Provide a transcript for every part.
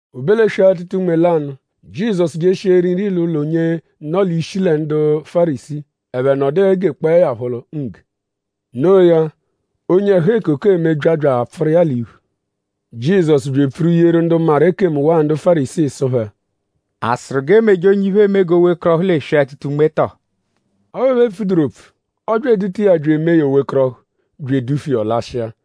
O be l'eswe-atụta-unme lanụ; Jizọsu jeshia eri nri l'ụlo onye nọ l'ishi lẹ ndu Fárisii; ẹphe nọdu egekpọe ya phọ ngge. Noo ya; onye ẹhu-ekoko eme bya bya apfụru iya l'iphu. Jizọsu bya epfuru yeru ndu maru ekemu waa ndu Fárisii sụ phẹ: “?A sụru g'e meje onye iphe eme g'o wekọrohu l'eswe-atụta-unme tọo?” Ọphu ẹphe epfuduru opfu. Ọ bya eduta iya bya emee ya o wekọrohu; bya edufu iya; ọ lashịa.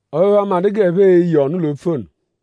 Ọphu ẹphe amadụ g'ẹphe e-ye ọnu l'opfu ono.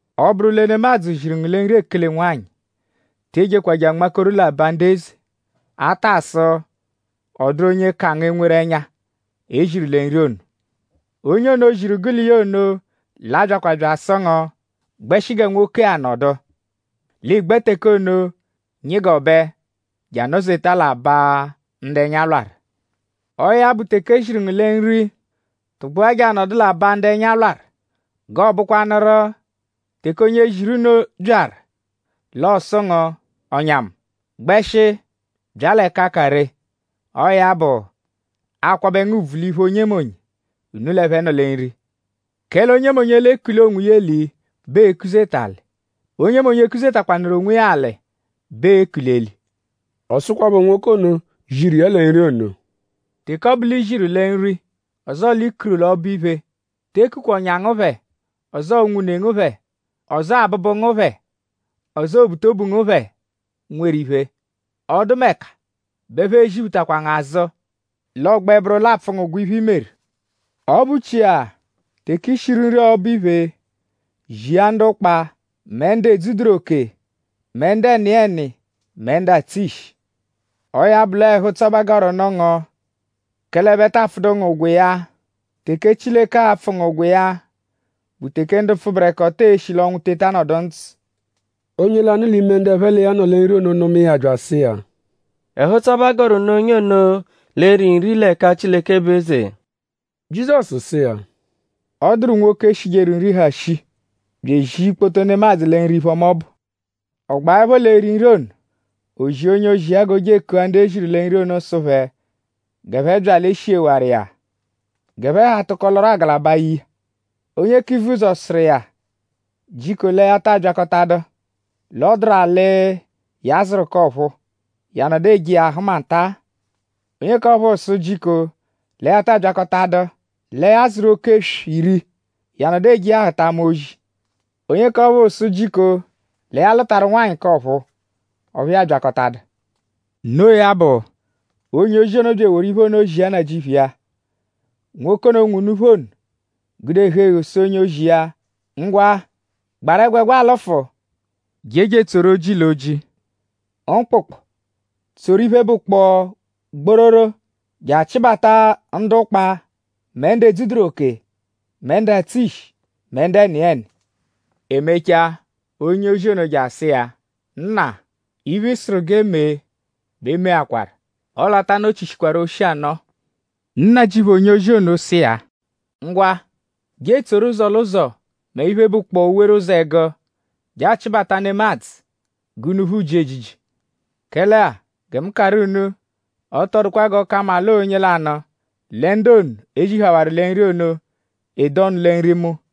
“Ọ -bụru lẹ nemadzụ ziru ngu lẹ nri ekele-nwanyị; te ejekwa je anmakoru l'aba ndu eze; atasụ ọ dụru onye ka ngu enweru ẹnya, e ziru lẹ nri ono. Onye ono, ziru gụ l'iya ono l'a-byakwa bya asụ ngu: ‘Gbẹshi gẹ nwoke-a nọdu.’ L'ị gbẹ teke ono nyịgobe je anọ-zeta l'aba ndu ẹnya lwarụ. Ọo ya bụ; teke e ziru ngu lẹ nri; tụgbua je anọdu l'aba ndu ẹnya lwarụ: g'ọo bụkwanuru; teke onye ziru unu byaru; l'ọo-sụ ngu: ‘Ọ̀nyà mu; gbẹshi bya l'ẹka ka ree’; ọo ya bụ; aa-kwabẹ ngu ùbvù l'iphu onyemonye, unu l'ẹphe nọ lẹ nri. Kẹle onyemonye, l'ekuli onwiya eli bẹ ee-kuzeta alị; onye kuzetakwanụru onwiya alị bẹ ee-kuli eli.” Ọ sụkwapho nwoke ono, ziru iya lẹ nri ono: “Teke ọ bụ l'i ziru lẹ nri; ọzoo l'i kuru ọbo-iphe; te kukwa ọ̀nyà ngu phẹ; ọzoo unwune ngu phẹ; ọzoo abụbu ngu phẹ; ọzoo obutobu ngu phẹ, nweru iphe. Ọ -dụmeka bẹ ẹphe e-ziphutakwa ngu azụ; l'ọogbe bụru l'aapfụ ngu ụgwo iphe, i meru. Ọ bụchia; teke i shiru nri ọbo-iphe; zia ndu ụkpa; mẹ ndu edzuduru oke; mẹ ndu ẹniyeni mẹ ndu atsụ ishi. Ọo ya bụ l'ọo ẹhu-ụtso bẹ a gọru nụ ngu; kẹle ẹphe taa pfụdu ngu ụgwo iya. Teke Chileke a-pfụ ngu ụgwo iya bụ teke ndu pfụberekoto e-shi l'ọnwu teta nọdu ndzụ.” Onye lanụ l'ime ndu ẹphe l'iya nọ lẹ nri ono nụma iya bya asụ iya: “Ẹhu-ụtso bẹ a gọru nụ onye ono, l'e-ri nri l'ẹka Chileke bụ eze!” Jizọsu sụ iya: “Ọ dụru nwoke, shijeru nri, ha shii; bya ezia ikpoto nemadzụ lẹ nri iphe-ọma ọbu. Ọ gbaẹpho l'eri nri ono; o zia onye-ozi iya g'o je ekua ndu e ziru lẹ nri ono sụ phẹ g'ẹphe bya l'e shighewaru iya. G'ẹphe ha tụko lọru agalaba ye iya. Onye k'ivuzọ sụru iya jiko lẹ ya taa byakọtadu. L'ọ dụru alị, ya zụru k'ọ̀phúú; ya nọdu eje iya ahụma nta-a. Onye k'ọphuu sụ jiko lẹ ya ta abyakọtadu. Lẹ ya zụru oke-eswi iri; ya nọdu eje iya ahụta ama ozi. Onye k'ọphuu sụ jiko lẹ ya lụtaru nwanyị k'ọ̀phúú; ọphu ya abyakọtadu. Noo ya bụ; onye-ozi ono bya eworu iphe ono zia nnajịuphu iya. Nwoke ono, nwe unuphu ono gude ẹhu-eghu sụ onye-ozi iya: ‘Ngwa; gbaru ẹgwegwa lụfu; jeje etsoru oji l'oji mkpụkpu tsoru iphe, bụkpoo gbororo je achịbata ndu ụkpa; mẹ ndu edzuduru oke; mẹ ndu atsụ ishi; mẹ ndu ẹniyeni.’ E mechaa; onye-ozi ono je asụ iya: ‘Nna; iphe, ị sụru g'e mee bẹ e meakwaru; ọle a ta nọ-chishikwaru oshi anọo.’ Nnajịuphu onye-ozi ono sụ iya: ‘Ngwa; je etsoru ụzo l'ụzo mẹ iphe, bụkpoo owere ụzo ẹgu je achịbata nemadzụ g'unuphu ji ejiji. Kẹle-a; gẹ mu karụ unu; ọ tọ dụkwa g'ọ ka mma l'ọo onye lanụ lẹ ndu ono, e zihawaru lẹ nri ono, e-de ọnu lẹ nri mu.’”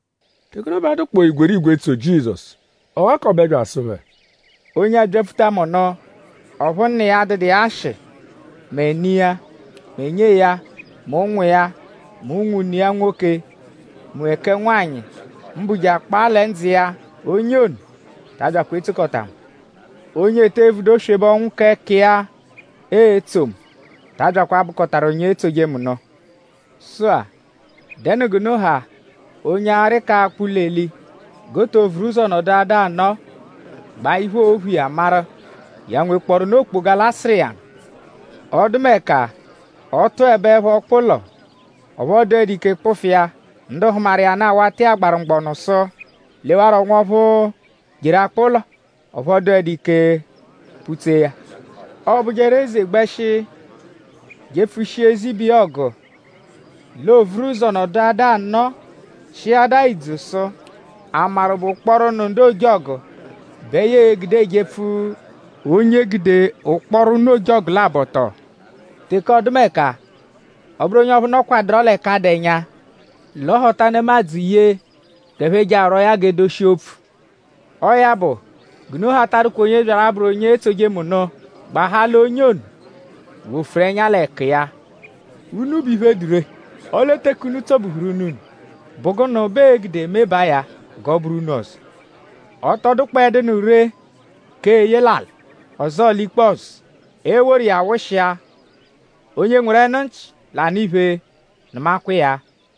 Teke ono bẹ a dụkpoo igwerigwe etso Jizọsu. Ọ ghakọbe bya asụ phẹ: “Onye abyapfuta mu nụ; ọphu nna iya adụdu iya ashị; mẹ ne iya; mẹ nyee ya; mẹ ụnwu iya; mẹ unwune iya nwoke; mẹ kẹ nwanyị; mbụ je akpaa lẹ ndzụ iya; onye ono ta abyakwa etsokọta mu. Onye ete evudu oswebe ọnwu k'ẹka iya etso mu ta abyakwa abụkotaru onye etsoje mu nụ. Sụ-a;?Dẹnu g'unu ha onye arị k'akpụ ụlo-eli; g'o to vuru ụzo nọduadaa anọo; gbaa iphe, oo-phu iya; maru:?ya nwekpọrunu okpoga, l'a-sụru iya nụ. Ọdumeka; ọ -tụebe ọkpa-ụlo; ọphu ọ dụedu ike kpụfu iya; ndu hụmaru iya nụ awata iya agbaru mgbọnu sụ: ‘Lewarọ nwọphu, jeru akpụ ụlo; ọphu ọ dụedu ike kpụ-tsee ya.’ Ọobujeru; eze -gbẹshi jepfushia eze ibe iya ọgu; l'o vuru ụzo nọduadaa anọo chịadaa idzu sụ:?a maru bụ ụkporo ụnu ndu ojọgu bẹ ya e-gude ejepfu onye gude ụkporo ụnu ojọgu labọ tọo? Teke ọdumeka ọo-bụru onye ọphuu -nọdukwaduro l'ẹka dụ ẹnya; l'ọ họta nemadzụ ye g'ẹphe je arwọo ya g'e doshia opfu. Ọo ya bụ; g'unu ha ta adụkwa onye byaru a-bụru onye etsoje mu nụ; gbahaa l'onye ono wofuru ẹnya l'ẹku iya.” “Únú bụ iphe, dụ ree; ọle teke únú tsọ-buhuru únú-únú;?bụ gụnu bẹ ee-gude mebaa ya g'ọ bụru únú ọzo? Ọ tọ dụkpoedunu ree k'eye l'alị; ọzoo l'ikpọzu. Ee-woru iya wụshia. Onye nweru ẹnu-nchi, l'anụ iphe; nụmakwa iya.”